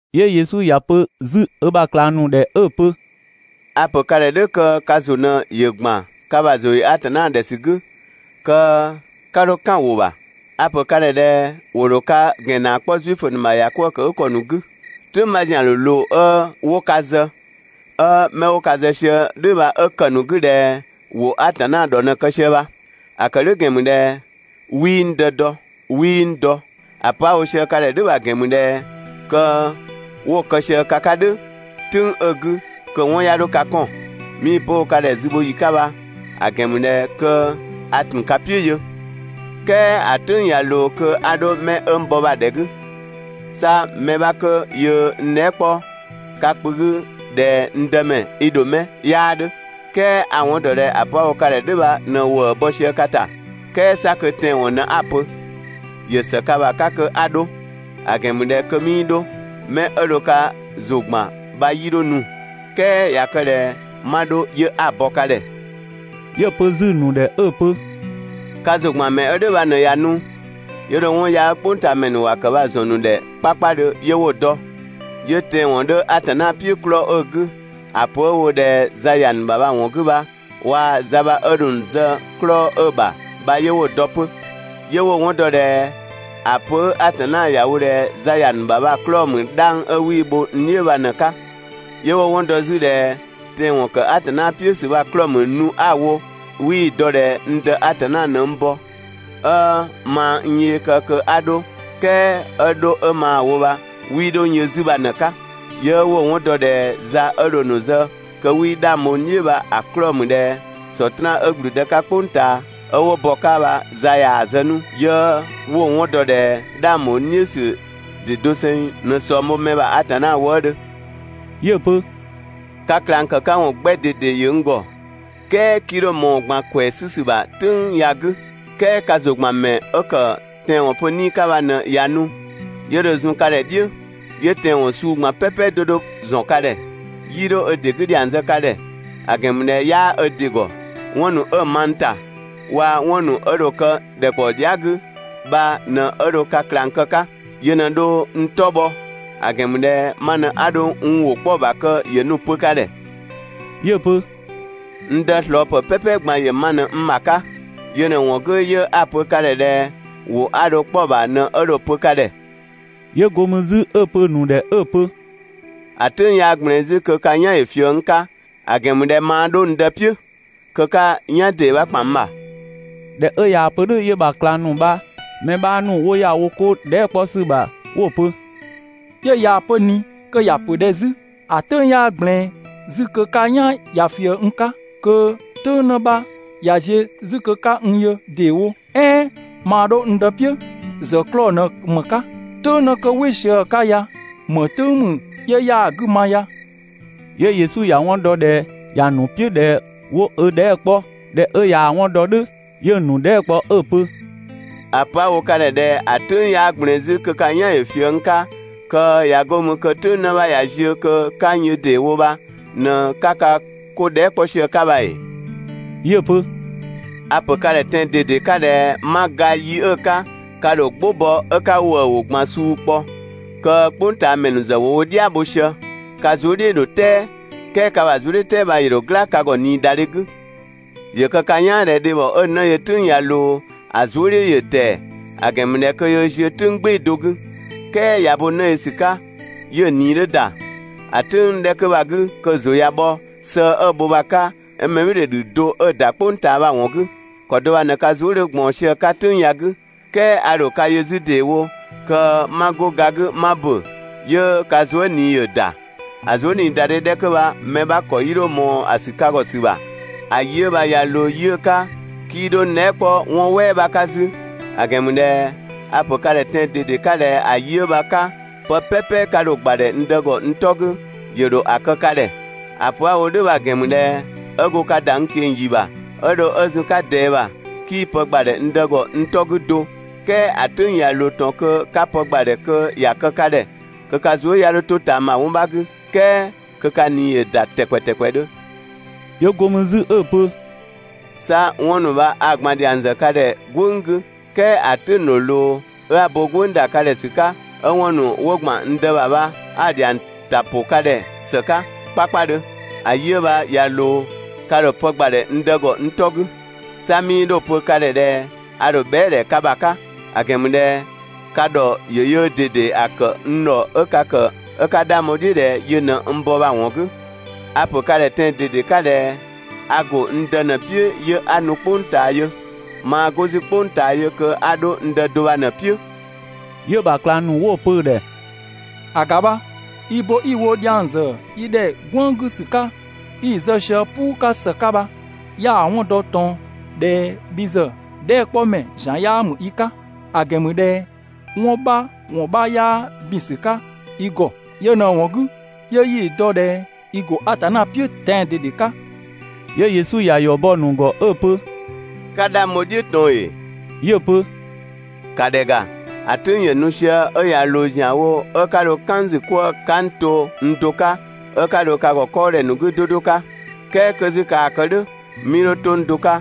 'Yö Yesu ‑ya pö 'zü ö ‑bha ꞊klang ‑nu ‑dhɛ 'ö‑ pö: «A‑ ‑pö ka ‑dhɛ "dhʋ̈ kö ka ‑zʋ ꞊në ‑yö ‑gban ka ‑bha ‑zʋ ‑yö Atanna ‑dhɛ ‑sü 'gü, kö 'ka 'dho "kan‑ ‑wʋ ‑bha. A‑ ‑pö ka ‑dhɛ ꞊dhɛ ‑wo ‑dho ka ‑gɛn ‑naa 'kpɔ Zuifö ‑nu ‑bha ‑yakwëë ‑kë 'gü ‑kɔ ‑nu 'gü. "Tʋ̈ng 'bha ‑zian ‑dho ꞊loo 'ö 'wo ka zë, 'ö 'mɛ 'wo ka zë sië "dhʋ̈ bha 'ö ‑kë ‑nu 'gü ꞊dhɛ ‑wo Atanna ‑dhɔ ꞊në‑ kë sië bha. ‑A ‑kë "dhʋ̈ ‑gɛn ‑mü ꞊dhɛ 'wii n Dë dɔ, 'wii n dɔ. ‑A pö 'a‑ wo sië ka ‑dhɛ "dhʋ̈ bha‑ ‑gɛn ‑mü ꞊dhɛ kö 'wo‑ kë sië ka 'ka "dhʋ̈ "tʋ̈ng 'ö‑ 'gü, kö‑ 'wɔn 'ya 'dho ka 'kɔn. 'Mii‑ pö 'ö‑ wo ka ‑dhɛ zü bho ‑yi 'ka bha‑ ‑gɛn ‑mü ꞊dhɛ kö a ‑tun ka "piʋ̈ yö. "Kɛɛ ‑a "tʋ̈ng ꞊ya ꞊loo kö 'a 'dho 'mɛ 'ö n bɔ bha‑ ‑dhɛ 'gü. 'Sa mɛ 'bha kö yöö n dhɛɛ" 'kpɔ ka kpö 'gü ꞊dhɛ «n Dëmɛ, i ‑dho 'mɛ?» 'yaa 'dhö. "Kɛɛ a‑ 'wɔn ‑dɔ ꞊dhɛ ‑a pö 'a‑ wo ka ‑dhɛ "dhʋ̈ bha ꞊në ‑wëë bɔ sië ka ‑ta. "Kɛɛ 'sa kö tɛanwɔn ꞊në 'a‑ pö. ‑Yö ‑së ka ‑bha 'ka kö 'a 'dho, ‑a ‑gɛn ‑mü ꞊dhɛ kö 'mii 'dho, 'mɛ 'ö dho ka ‑zʋ ‑gban bha 'yii 'dho nu, "kɛɛ ꞊ya kë ꞊dhɛ 'ma 'dho 'yö 'a‑ bɔ ka ‑dhɛ.» 'Yö‑ pö 'zü‑ ‑nu ‑dhɛ 'ö‑ pö: «Ka ‑zʋ ‑gban ‑mɛ 'ö "dhʋ̈ bha ꞊në ꞊ya nu, 'yö dho 'wɔn yaa 'ö "kpʋngtaamɛ ‑nu ‑wa ‑kë bha‑ ‑zɔn ‑nu ‑dhɛ 'kpakpadhö 'yö 'wo‑ dɔ. 'Yö tɛanwɔn 'dhö Atanna "piʋ̈ 'klɔɔ‑ 'ö‑ 'gü, ‑a pö 'ö‑ wo ꞊dhɛ za ‑ya ‑nu ‑bha bha‑ ‑wɔn 'gü bha, waa za bha 'ö dho‑ ‑nu zë 'klɔɔ‑ 'ö‑ ‑bha bha 'yö 'wo‑ dɔ 'pö. 'Yö 'wo‑ 'wɔn dɔ ꞊dhɛ ‑a pö 'ö Atanna ‑ya wo ꞊dhɛ za ‑ya ‑nu ‑bha bha‑ 'klɔɔ‑ ‑mü 'dhang 'ö 'wii‑ bho n "dhiʋ̈ bha ꞊në‑ 'ka. 'Yö 'wo‑ 'wɔn dɔ 'zü ꞊dhɛ tɛanwɔn ‑kë Atanna "piʋ̈ ‑sü bha‑ 'klɔɔ‑ ‑mü nu 'a‑ wo 'ö 'wii‑ dɔ ꞊dhɛ n Dë Atanna ꞊në n bɔ, 'ö maa n yee kë kö 'a 'dho, "kɛɛ 'ö 'dho 'ö maa‑ wo bha 'wii 'dho n yö 'zü bha ꞊në‑ 'ka. 'Yö 'wo‑ 'wɔn dɔ ꞊dhɛ za 'ö dho‑ ‑nu zë kö 'wii 'dhang bho n "dhiʋ̈ bha‑ 'klɔɔ‑ ‑mü ꞊dhɛ Sɔtraan 'ö ‑gblüdë 'ka "kpʋng ꞊taa, 'ö 'wo bɔ‑ 'ka bha za ꞊yaa‑ zë 'nu ('yö 'wo‑ 'wɔn dɔ ꞊dhɛ 'dhang ‑bho n "dhiʋ̈ ‑sü ‑dɩ doseng ꞊në ꞊sɔng bho mɛ ‑bha Atanna wëëdhö).» 'Yö‑ pö: «Ka ꞊klang ‑kë 'ka ‑wɔn 'gbɛ ꞊dede ‑yö n ‑gɔ, "kɛɛ 'kii 'dho ꞊mɔɔ‑ ꞊gban ‑kwɛɛ 'sü ‑sü bha "tʋ̈ng ya‑ 'gü. "Kɛɛ ka ‑zʋ ‑gban ‑mɛ 'ö ‑kë tɛanwɔn pö 'Nii‑ 'ka bha ꞊në ꞊ya nu, 'yö dho zun ka ‑dhɛ "dhiʋ̈, 'yö tɛanwɔn suu ꞊gban "pɛpɛ 'do 'do ‑zɔn ka ‑dhɛ. 'Yii 'dho ö ‑dɩ 'gü ‑dhiang zë ka ‑dhɛ, ‑a ‑gɛn ‑mü ꞊dhɛ 'yaa ö ‑dɩ ‑gɔ. 'Wɔn ‑nu 'ö‑ ma n ‑ta, waa‑ 'wɔn ‑nu 'ö dho kë ‑dhɛkpaɔ dhia" 'gü bha ꞊në 'ö dho ka ꞊klang kë‑ 'ka. Yö ꞊në dho n 'tɔ bhɔ, ‑a ‑gɛn ‑mü ꞊dhɛ ma ꞊në 'a dho n ‑wʋ 'kpɔ‑ ‑bha kö ‑yö nu‑ pö ka ‑dhɛ. 'Yö‑ pö: «N Dë ꞊slɔɔpë "pɛpɛ ꞊gban ‑yö ma ꞊në n ‑bha 'ka. Yö ꞊në‑ ‑wɔn 'gü 'yö 'a‑ pö ka ‑dhɛ ꞊dhɛ ‑wʋ 'a dho‑ 'kpɔ‑ ‑bha ꞊në 'ö dho‑ pö ka ‑dhɛ.» 'Yö 'go mü 'zü 'ö‑ pö‑ ‑nu ‑dhɛ 'ö‑ pö: «‑A "tʋ̈ng 'yaa ꞊gblɛɛn 'zü kö ka "yan ‑yö ꞊fië n 'ka, ‑a ‑gɛn ‑mü ꞊dhɛ (maa 'dho n Dë "piʋ̈). Kö "tʋ̈ng 'në 'bha ꞊ya ziö 'zü kö 'ka "yan ‑dee 'bha ‑kpan n ‑bha. ꞊Dhɛ 'ö ꞊yaa‑ pö "dhʋ̈, 'yö‑ ‑bha ꞊klang ‑nu bha‑ mɛ 'bha ‑nu 'wo ‑ya wo 'ko dhɛɛ" 'kpɔ ‑sü ‑bha 'wo‑ pö: «'Yö ꞊yaa‑ pö ꞊ni kö ‑ya ‑pö ꞊dhɛ 'zü «‑a "tʋ̈ng 'yaa ꞊gblɛɛn 'zü kö ka "yan ‑yö ꞊fië n 'ka, kö "tʋ̈ng 'në 'bha ꞊ya ziö 'zü kö 'ka n yö ‑deewo», "ɛɛn «maa 'dho n Dë "piʋ̈» ‑zë 'klɔɔ‑ ꞊në ‑më 'ka? "Tʋ̈ng 'në kö "wɩ sië‑ 'ka ya ‑më "tʋ̈ng ‑mü 'yö 'yaa‑ 'gü ma ya?» 'Yö Yesu ‑ya 'wɔn dɔ ꞊dhɛ ‑ya ‑nu "piʋ̈ ꞊dhɛ 'wo ö dhɛɛ" 'kpɔ. ꞊Dhɛ 'ö ꞊yaa‑ 'wɔn dɔ "dhʋ̈ 'yö‑ ‑nu dhɛɛ" 'kpɔ 'ö‑ pö: «‑A pö 'a‑ wo ka ‑dhɛ ꞊dhɛ ‑a "tʋ̈ng 'yaa ꞊gblɛɛn 'zü kö ka "yan ‑yö ꞊fië n 'ka, kö ꞊ya 'go mü kö "tʋ̈ng 'në 'bha ꞊ya ziö kö 'ka n yö ‑deewo bha ꞊në‑ 'ka ka 'ko ‑nu dhɛɛ" 'kpɔ sië‑ 'ka bha ‑ee? 'Yö‑ pö: «A‑ ‑pö ka ‑dhɛ tɛan‑ ꞊dede 'ka ꞊dhɛ ('ma ga yi 'ö‑ 'ka) ka ‑dho "gbʋ bɔ 'ö 'ka ‑wëë ‑wʋ ꞊gban suu kpɔ, kö "kpʋngtaamɛ ‑nu ‑zë ‑wo wo "dhia bho sië. Ka zuë" "dhiʋ̈ ‑dho "tɛɛ, "kɛɛ ka ‑bha zuëdhiʋ̈tɛɛ bha 'yö ‑dho "gla ka ‑gɔ ꞊niidadhe 'gü. ‑Yö kë ka "yaan ꞊dhɛ dhebhɔ 'ö‑ 'në yö "tʋ̈ng ꞊ya ꞊loo, ‑a zuë" "dhiʋ̈ ‑yö ‑tɛɛ, ‑a ‑gɛn ‑mü ꞊dhɛ kö yöö ziö "tʋ̈ng "gbɩɩ‑ do 'gü. "Kɛɛ ꞊ya bo 'në yö ‑sü 'ka 'yö‑ ꞊nii ‑yö ‑da, ‑a "tʋ̈ng 'dhɛ 'kö bha‑ 'gü kö‑ ‑zʋ ꞊ya bhɔ sëë 'ö‑ bho bha‑ 'ka 'ö mɛbhɩɩdhe ‑dhü do 'ö ‑da "kpʋng ꞊taa bha‑ ‑wɔn 'gü. ‑Kɔ do bha ꞊në ka zuë" 'dhö ꞊gbaɔn sië‑ 'ka "tʋ̈ng ya‑ 'gü, "kɛɛ a ‑dho ka yö 'zü ‑deewo (kö 'ma 'go ga 'gü 'ma ‑bö), 'yö ka zuë" ꞊nii ‑yö ‑da. ‑A zuëniidadhe 'dhɛ 'kö bha mɛ 'bha ‑kɔ 'yii 'dho ꞊mɔɔ‑ ‑sü ka ‑gɔ ‑sü ‑bha. ‑A yi 'ö bha ꞊ya ꞊loo yi 'ö 'ka, 'kii 'dho n dhɛɛ" 'kpɔ 'wɔn "wɛɛ 'bha 'ka 'zü; ‑a ‑gɛn ‑mü ꞊dhɛ a‑ ‑pö ka ‑dhɛ tɛan‑ ꞊dede 'ka ꞊dhɛ ‑a yi 'ö bha‑ 'ka, pë "pɛpɛ ka dho‑ ‑gbadhɛ n Dë ‑gɔ n 'tɔ 'gü, ‑yö ‑dho ‑a kë ka ‑dhɛ. ‑A pö 'a‑ wo "dhʋ̈ bha‑ ‑gɛn ‑mü ꞊dhɛ ('ö go ka ‑da n ꞊keng‑ ‑yi ‑bha) 'ö dho 'ö zun‑ 'ka ꞊dɛɛ ‑bha, 'kii pë ‑gbadhɛ n Dë ‑gɔ n 'tɔ 'gü do, "kɛɛ ‑a "tʋ̈ng ꞊ya ꞊loo ꞊tɔn kö 'ka pë ‑gbadhɛ kö ‑ya kë ka ‑dhɛ (kö ka zuë" 'ya 'dho 'to ꞊taama 'wɔn 'bha 'gü,) "kɛɛ kö ka ꞊nii ‑yö ‑da ‑tɛkpɛ ‑tɛkpɛdhö.» 'Yö 'go mü 'zü 'ö‑ pö: «'Sa 'wɔn ‑nu bha a‑ ꞊gban ‑dhiang ‑zë ka ‑dhɛ "gwënng 'gü, "kɛɛ ‑a "tʋ̈ng ‑dho ꞊loo 'ö 'a bo "gwënng ‑da ka ‑dhɛ ‑sü 'ka, 'ö 'wɔn ‑nu 'wo ‑gban n Dë ‑bha bha 'a‑ ‑dhiang ‑ta ‑pʋ ka ‑dhɛ ‑së 'ka 'kpakpadhö. ‑A yi 'ö bha ꞊ya ꞊loo, ka ‑dho pë ‑gbadhɛ n Dë ‑gɔ n 'tɔ 'gü. 'Sa 'mii 'dho‑ pö ka ‑dhɛ ꞊dhɛ a ‑dho bhɛa"‑ ‑dhɛ ka ‑bha 'ka, ‑a ‑gɛn ‑mü ꞊dhɛ ka ‑dhɔ ‑yö yöö ꞊dede ‑a ‑kë n ‑dhɔ 'ö ka ‑kë 'ö 'ka 'dhang bho‑ "dhiʋ̈ ꞊dhɛ yö ꞊në n bɔ bha‑ ‑wɔn 'gü. A‑ pö ka ‑dhɛ tɛan‑ ꞊dede 'ka ꞊dhɛ a ‑go n Dë ꞊në‑ "piʋ̈ 'yö 'a nu "kpʋng ꞊taa yö, maa 'go 'zü "kpʋng ꞊taa yö kö 'a 'dho n Dë do bha ꞊në‑ "piʋ̈.» 'Yö‑ ‑bha ꞊klang ‑nu 'wo‑ pö‑ ‑dhɛ: «‑A ‑ga bha! I bo 'i‑ wo dhiang ‑zë yi ‑dhɛ "gwënng 'gü ‑sü 'ka 'i‑ zë sië "puu 'ka ‑së 'ka bha, 'ya‑ 'wɔn dɔ ꞊tɔn ꞊dhɛ bhi ‑zë dhɛɛ" 'kpɔ ‑mɛ ‑zian 'yaa ‑mü i 'ka; ‑a ‑gɛn ‑mü ꞊dhɛ 'wɔn 'bha ‑wɔn 'bha 'yaa ‑bin ‑sü 'ka i ‑gɔ. Yö ꞊në‑ ‑wɔn 'gü 'yö 'yi‑ dɔ ꞊dhɛ i ‑go Atanna "piʋ̈ tɛan‑ ꞊dede 'ka.» 'Yö Yesu ‑ya ‑yɔ bɔ‑ ‑nu ‑gɔ 'ö‑ pö: «'Ka 'dhang bho‑ "dhiʋ̈ ꞊tɔn ‑ee?» 'Yö‑ pö: «‑Ka ‑dhɛ ‑ga, ‑a "tʋ̈ng ‑yö nu sië 'ö ꞊ya ꞊loo ‑zianwo 'ö 'ka dho "kan n ‑zü 'kwëë‑ 'ka n to n do 'ka, 'ö 'ka dho ka ‑gɔ 'kɔɔdhɛ ‑nu 'gü 'do 'do 'ka. "Kɛɛ 'kö 'zü kaa‑ kë "dhʋ̈, 'mii 'dho 'to n do 'ka,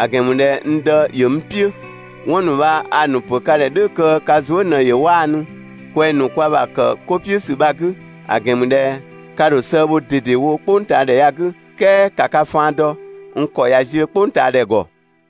‑a ‑gɛn ‑mü ꞊dhɛ n Dë ‑yö n "piʋ̈. 'Wɔn ‑nu bha a‑ ‑nu ‑pö ka ‑dhɛ "dhʋ̈ kö ka zuë" ꞊në ‑yö 'waanu kwɛng‑ ‑nu kwa ‑bha ‑kë 'ko "piʋ̈ ‑sü bha‑ 'gü; ‑a ‑gɛn ‑mü ꞊dhɛ ka ‑dho sëë bho ꞊dedewo "kpʋngtaadhɛ ya‑ 'gü, "kɛɛ ‑ka ka faan dɔ, n ‑kɔ ꞊ya ziö "kpʋngtaadhɛ ‑gɔ.»